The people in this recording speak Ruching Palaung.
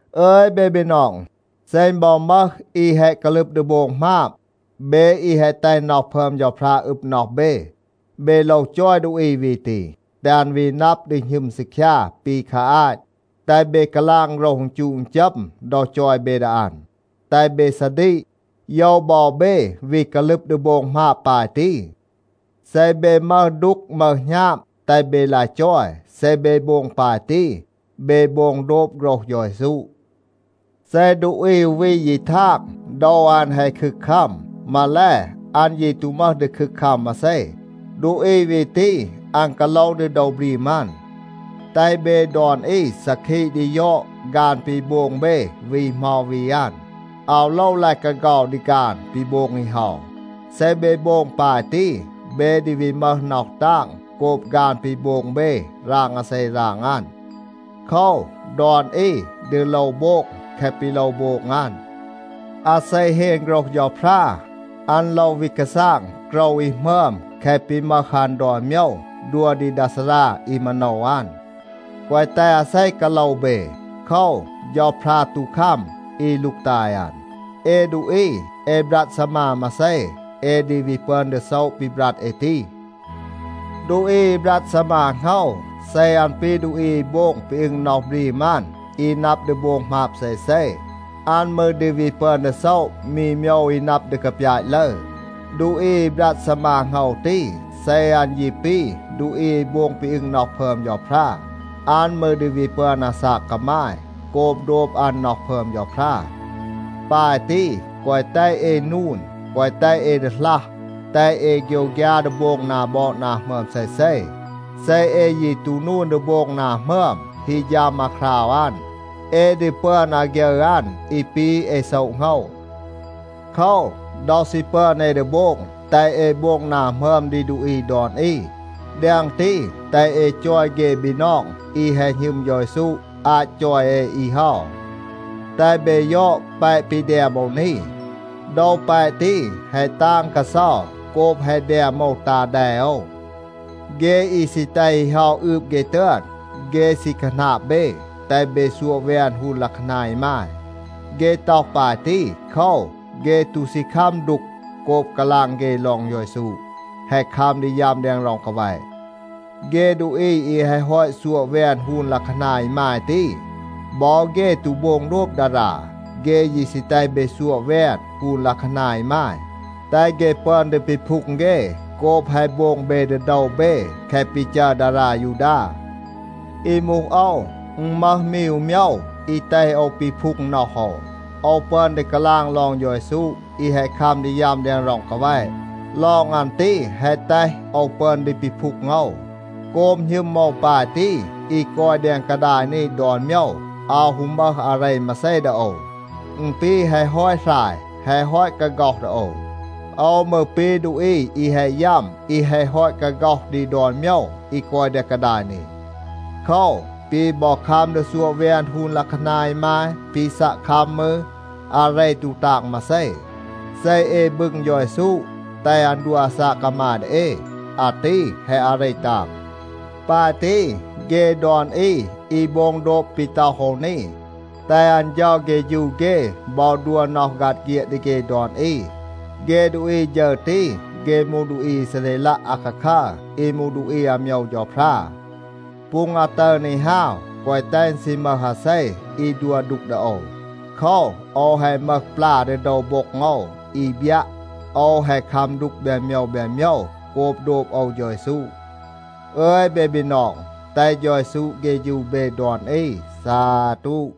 อึย เบ บีนอง, เซ อึณ บอ มึห อี แฮะ กาลึบ ดี โบง หมาบ, เบ อี แฮะ แตห น็อห พึอม เฌาพรา อึบ น็อห เบ, เบ โลว จอย ดูอี วี ตี, แตห อัน วี นับ ดี หณึม ซีคยา ปี คา อาต. แตห เบ กาลาง โฆรห อึณจูะ อึณจัม ดอ จอย เบ ดี อัน. แตห เบ ซาดีก, โยว บอ เบ วี กาลึบ ดี โบง หมาบ ปาย ตี. เซ เบ มึห ดูก มึห หณาบ, แตห เบ ลาย จอย. เซ เบ โบง ปาย ตี, เบ โบง โดบ โฆรห เฌา เยซู. เซ ดูอี อู วี ยี ทาง, โดว อัน แฮะ คึกคัม, มาแล, อัน ยี ตู มึห ดี คึกคัม มาเซ, ดูอี วี ตี, อัน กาโลว ดี โดว บรีม อัน. แตห เบ ดอน อี ซาคีะ ดี ยอด ฆาน ปี โบง เบ วี เหมา วี อัน. อาว โลว ลาย กาเฆา ดี ฆาน ปี โบง อี เฮา. เซ เบ โบง ปาย ตี, เบ ดี วี มึห น็อห ตาง โกบ ฆาน ปี โบง เบ ราง อาเซ ราง อัน. โคว, ดอน อี ดี โลว โบง แคะ ปี โลว โบง อัน. อาเซ เฮน โฆรห เฌาพรา, อัน โลว วี กาซาง โกรว อี หมึอม แคะ ปี มึห อัน ดอน โมยว, ดัว ดี ดา ซารา อี มาโนว อัน. แกวะ แตห อาเซ กาโลว เบ. โคว, เฌาพรา ตู คัม อี ลูกตาย อัน. เอ ดูอี, เอ บรัด ซีมา มาเซ, เอ ดี วี ปึอน ดี โซะ ปี บรัด เอ ตี. ดูอี อี บรัด ซีมา โหงว, เซ อัน ปี ดูอี อี โบง ปี อึง น็อห บรีม อัน อี นับ ดี โบง หมาบ เซเซ, อัน มืร ดี วี ปึอน ดี โซะ มี โมยว อี นับ ดี กาปยาต ลึร. ดูอี อี บรัด ซีมา โหงว ตี, เซ อัน ยี ปี ดูอี อี โบง ปี อึง น็อห พึอม เฌาพรา, อัน มืร ดี วี ปึอน อาซาก กามาย โกบ โดบ อัน น็อห พึอม เฌาพรา. ปาย ตี, แกวะ แตห เอ นูน, แกวะ แตห เอ ดีหลัห. แตห เอ โฆยวฆยา ดี โบง นา บอด นา หมึอม เซเซ. เซ เอ ยี ตู นูน ดี โบง นา หมึอม, ฮี ฌัม อาคราว อัน, เอ ดี ปึอน อาฆยึร อัน อี ปี เอ โซะ โหงว. โคว, ดอ ซี ปึอน เอ ดี โบง, แตห เอ โบง นา หมึอม ดี ดูอี ดอน อี. แดง ตี, แตห เอ จอย เฆ บีนอง อี แฮะ หณึม เฌา เยซู อาต จอย เอ อี เฮา. แตห เบ ยอด แปะ ปี แดม โอว นี. โดว แปะ ตี แฮะ ตาง กาเซา โกบ แฮะ แดม โอว ตา แด โอว. เฆ อี ซี แตห อี เฮา อืบ เฆ ตึอน, เฆ ซี คาหนาบ เบ, แตห เบ ซัวะ แวน ฮูน ลัะคานา อีมาย. เฆ ต็อห ปาย ตี, โคว, เฆ ตู ซี คัม ดูก โกบ กาลาง เฆ ลอง เฌา เยซู แฮะ คัม ดี ยัม แดง ร็อง กาแวะ. เฆ ดูอี อี แฮะ ฮอต ซัวะ แวน ฮูน ลัะคานา อีมาย ตี, บอ เฆ ตู โบง โดบ ดารา. เฆ ยี ซี แตห เบ ซัวะ แวน ฮูน ลัะคานา อีมาย, แตห เฆ ปึอน ดี ปีพูง เฆ โกบ แฮะ โบง เบ ดี โดว เบ แคะ ปี จัร ดารา ยูดา. อี มูห โอว, อึณ มึห มี อู โมยว อี แตห โอว ปีพูง น็อห โอว. โอว ปึอน ดี กาลาง ลอง เฌา เยซู อี แฮะ คัม ดี ยัม แดง ร็อง กาแวะ. ลอง อัน ตี แฮะ แตห โอว ปึอน ดี ปีพูง โอว. โกบ หณึม โอว ปาย ตี, อี กอย แดง กาดาย นี ดอน โมยว อาว ฮู มึห อาเร มาเซ ดี โอว. อึณ ปี แฮะ ฮอต หราย, แฮะ ฮอต กาฆ็อห ดี โอว. โอว มืร ปี ดูอี อี แฮะ ยัม อี แฮะ ฮอต กาฆ็อห ดี ดอน โมยว อี กอย แดง กาดาย นี. โคว, ปี บอ คัม ดี ซัวะ แวน ฮูน ลัะคานา อีมาย, ปี ซัะ คัม มืร, อาเร ตู ตาง มาเซ. เซ เอ บึง เฌา เยซู, แตห อัน ดัว อาซาก กามาย ดี เอ, อาตี แฮะ อาเร ตาง. ปาย ตี, เฆ ดอน อี อี โบง โดบ ปี ต็อห โอว นี, แตห อัน เฌา เฆฌู เฆ บอ ดัว น็อห ฆัด เฆียด ดี เฆ ดอน อี. เฆ ดูอี ฌึร ตี, เฆ มูห ดูอี อีซาเรลัะ อาคาคัร อี มูห ดูอี อาโมยว เฌาพรา. ปูง อาตึร นี ฮาว, แกวะ แตห อึณ ซี มึห อาเซ อี ดัว ดูก ดี โอว. โคว, โอว แฮะ มึห ปลา ดี โดว โบ็ง โอว อี บยัะ, โอว แฮะ คัม ดูก แบน โมยว แบน โมยว โกบ โดบ โอว เฌา เยซู. อึย เบ บีนอง, แตห เฌา เยซู เฆฌู เบ ดอน อี. ซาตู.